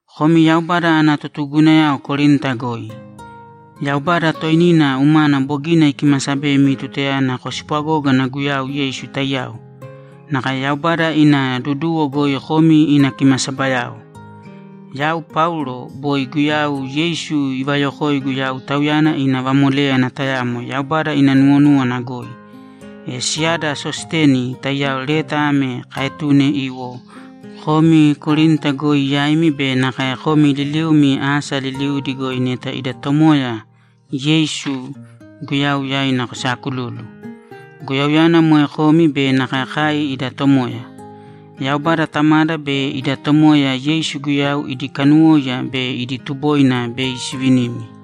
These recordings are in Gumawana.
Komi Yaubada ana totugugunayao Korinta goi, Yaubada toinina umana bogina ikimasabemi tutayana kospwagógana Guyau Yeisu taiyao. Nakae Yaubada ina duduwo goi komi ina kimasabayao. Yau Paulo, boi Guyau Yeisu ivayokoigu yau Tauyana ina vamoléyana tayamo Yaubada ina nuwonúwana goi. E siyada Sositeni taiyao leta ame kaetune iwo komi Korinta goi yaimi be nakae komi liliumi asa liliudi goi neta ida Tomoya Yeisu Guyau yaina kosaakululu. Guyauyana moe komi be nakae kai ida Tomoya. Yaubada Tamada be ida Tomoya Yeisu Guyau idi kanuwóiya be idi tuboina bei sivinimi.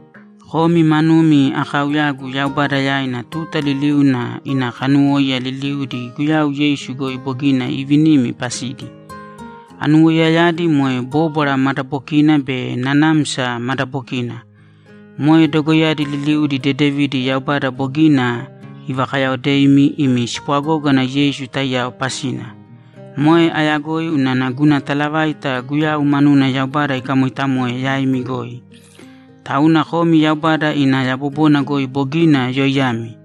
Komi manumi akaauyagu Yaubada yaina tuta liliuna ina kanuwóiya liliudi Guyau Yeisu goi bogina ivinimi pasidi. Anuwoiyayadi moe bóbwara madabokina be nanamsa madabokina. Moe dogoiyadi liliudi dedevidi Yaubada bogina ivakayaodeimi imi spwagógana Yeisu taiyao pasina. Moe ayagoi unana guna talavaita Guyau manuna Yaubada ikamoitamoe yaimi goi. Tauna komi Yaubada ina yabobona goi bogina yoiyami;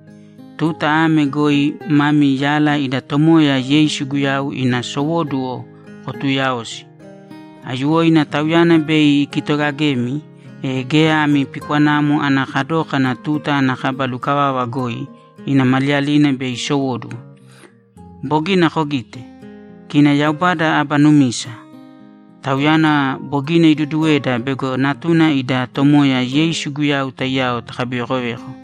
tuta ame goi mami yala ida Tomoya Yeisu Guyau ina sowóduwo kotuuyaosi. Aiyuwoina Tauyana bei ikitogagemi, e geya ami pikwanamo ana kadókana tuta ana kaba lukavava goi ina maliyalina bei isowóduwo. Bogina kogite? Kina Yaubada aba numisa. Tauyana bogina iduduweda bego Natuna ida Tomoya Yeisu Guyau taiyao takabivekoveko.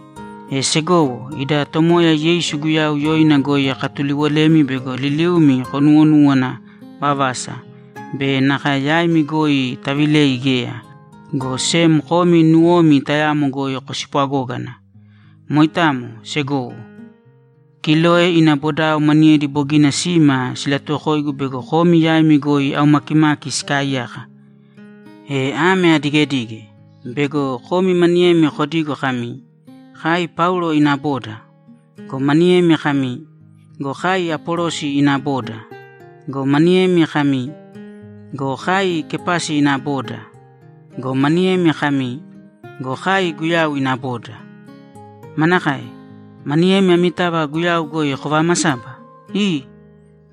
E segowo, ida Tomoya Yeisu Guyau yoina goi akatuliwolemi bego liliumi konuwonuwana vavasa be nakae yaimi goi tavilei geya, go sem komi nuwomi tayamo goi kospwagōgana. Moitamo, segowo. Kiloe ina bodao maniyedi bogina sima silatuwokoigu bego komi yaimi goi aumakimaki sikaaiyaka. E ame adigedige: Bego komi maniyemi kodigo kami, ‘Kai Paulo ina boda.’ Go maniyemi kami, ‘Go kai Apolosi ina boda.’ Go maniyemi kami, ‘Go kai Kepasi ina boda.’ Go maniyemi kami, ‘Go kai Guyau ina boda.’ Manakae? Maniyemi amitava Guyau goi kovamasaba? Ii!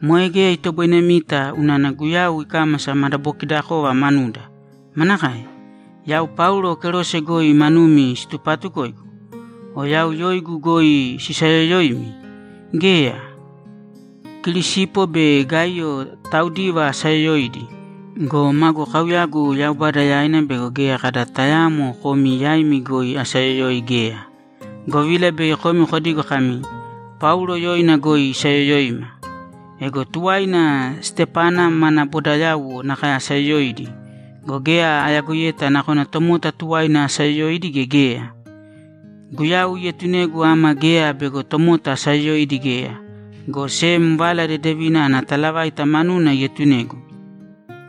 Moe geya itoboinemita unana Guyau ikámasa madabokidakova manuda! Manakae? Yau Paulo kerose goi manumi situpatukoigu? O yau yoigu goi sisayoyoimi? Geya! Kirisipo be Gaiyo taudiva asayoyoidi go, magu kauyagu Yaubada yaina bego geya kada tayaamo komi yaimi goi asayoyoi geya, govila bei komi kodigo kami, ‘Paulo yoina goi isayoyoima.’ Ego tuwaina Stepana mana bodayauwo nakae asayoyoidi go, geya ayagoiyeta nakona tomota tuwaina asayoyoidi gea geya. Guyau ietunegu ama geya bego tomota asayoyoidi geya, go sem Vala Dedevina ana talavaita manuna ietunegu.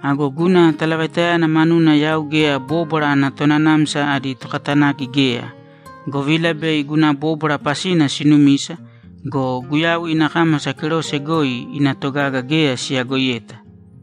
Ago guna talavaitayana manuna yau geya bóbwara ana tonanamsa adi tokatanaki geya, govila bei guna bóbwara pasina sinumisa go, Guyau ina kámasa kerose goi ina togaga geya siyagoiyeta!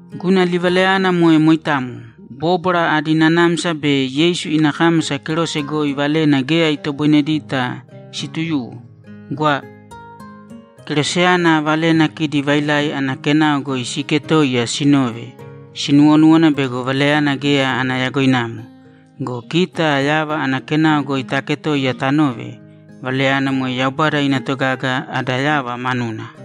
Guna livalayana moe moitamo. Bóbwara adi nanamsa be Yeisu ina kámasa kerose goi valena geya itoboinedita situyuwo. Gwa. Keroseyana valena kidi vailai ana kenao goi siiketoiya sinove, sinuwonúwana bego valayana geya ana yagoinamo go, kita yava ana kenao goi taaketoiya tanove, valayana moe Yaubada ina togaga ada yava manuna.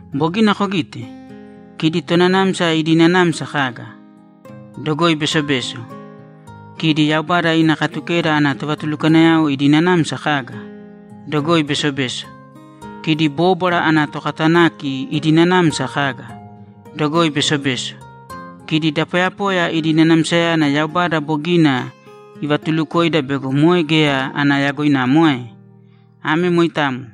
Bogina kogite? Kidi tonanamsa idi nanamsa kaga? Dogoi besobeso. Kidi Yaubada ina Katukeda ana tovatulukwanayao idi nanamsa kaga? Dogoi besobeso. Kidi bóbwara ana tokatanaki idi nanamsa kaga? Dogoi besobeso. Kidi da poyapoya idi nanamsayana Yaubada bogina ivatulukoida bego moe geya ana yagoinamo ae? Ame moitamo.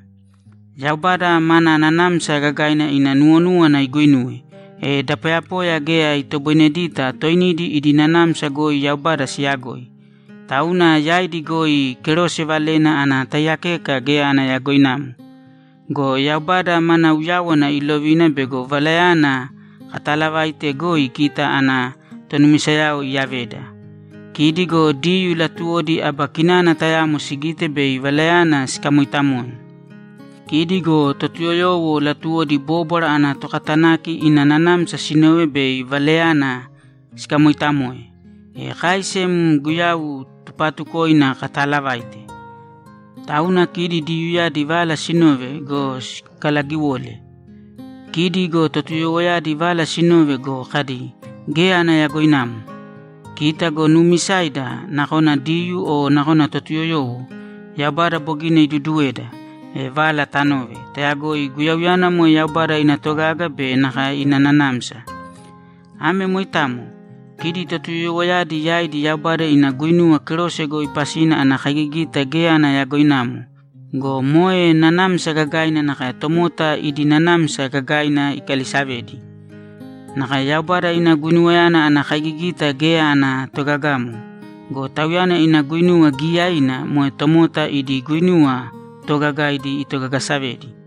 Yaubada mana nanamsa gagaina ina nuwonúwana iguinuwe, e da poyapoya geya itoboinedita toinidi idi nanamsa goi Yaubada siyagoi, tauna yaidi goi kerose valena ana taiyakeka geya ana yagoinamo. Go Yaubada mana uyáwana ilovina bego valayana kataalavaite goi kita ana tonumisayao iyaveda. Kidi go Diyuu latuwodi aba kinana tayamo sigite bei valayana sikamoitamoe. Kidi go Totuyoyowo latuwodi bóbwara ana tokatanaki ina nanamsa sinove bei valayana sikamoitamoe. E kai sem Guyau tupaatukoina kataalavaite. Tauna kidi Diyuuyadi vala sinove go, sikalagiwole. Kidi go Totuyoyowoyadi vala sinove go, kadi, ‘Geya ana yagoinamo.’ Kita go nuumisaida, nakona Diyuu o nakona Totuyoyowo, Yaubada bogina iduduweda, e vala tanove, tayagoi Guyauyana moe Yaubada ina togaga be nakae ina nanamsa. Ame moitamo. Kidi Totuyoyowoyadi yaidi Yaubada ina guinuwa kerose goi pasina ana kaigigita geya ana yagoinamo go, moe nanamsa gagaina nakae tomota idi nanamsa gagaina ikalisavedi. Nakae Yaubada ina guinuwayana ana kaigigita geya ana togagamo go, Tauyana ina guinuwa giyaiina moe tomota idi guinuwa toogagaidi itogagasavedi.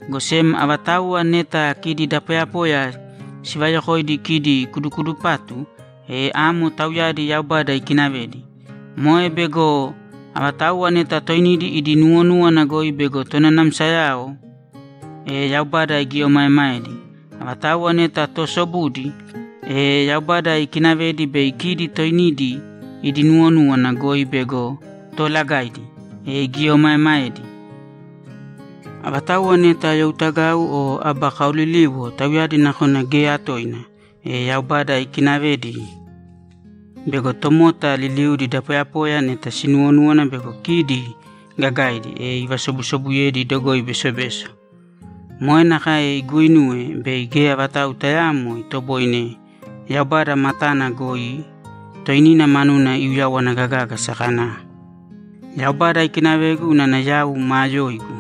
Go sem avatauwa neta kidi da poyapoya sivayokoidi kidi kudukudupatu, e amo tauyadi Yaubada ikinavedi. Moe bego avatauwa neta toinidi idi nuwonúwana goi bego tonanamsayao, e Yaubada igieomaemaedi. Avatauwa neta toosobudi, e Yaubada ikinavedi bei kidi toinidi idi nuwonúwana goi bego toolagaidi, e igieomaemaedi. Avatauwa neta youtagau o aba kaoliliwo, tauyadi nakona geya toina, e Yaubada ikinavedi bego tomota liliudi da poyapoya neta sinuwonúwana bego kidi gagaidi, e ivasobusobuyedi dogoi besobeso. Moe nakae iguuinuwe bei geya vatau tayaamo itoboine Yaubada matana goi toinina manuna iuyawana gagágasa kana, ‘Yaubada ikinavegu unana yau maa yoigu.’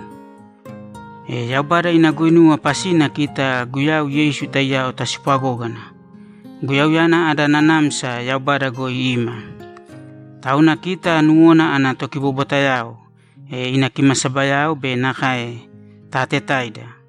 E Yaubada ina guinuwa pasina kita Guyau Yeisu taiyao taspwagógana. Guyauyana ada nanamsa Yaubada goi ima. Tauna kita nuwona ana tokibobwatayao, ina kimasabayao be nakae taatetaida.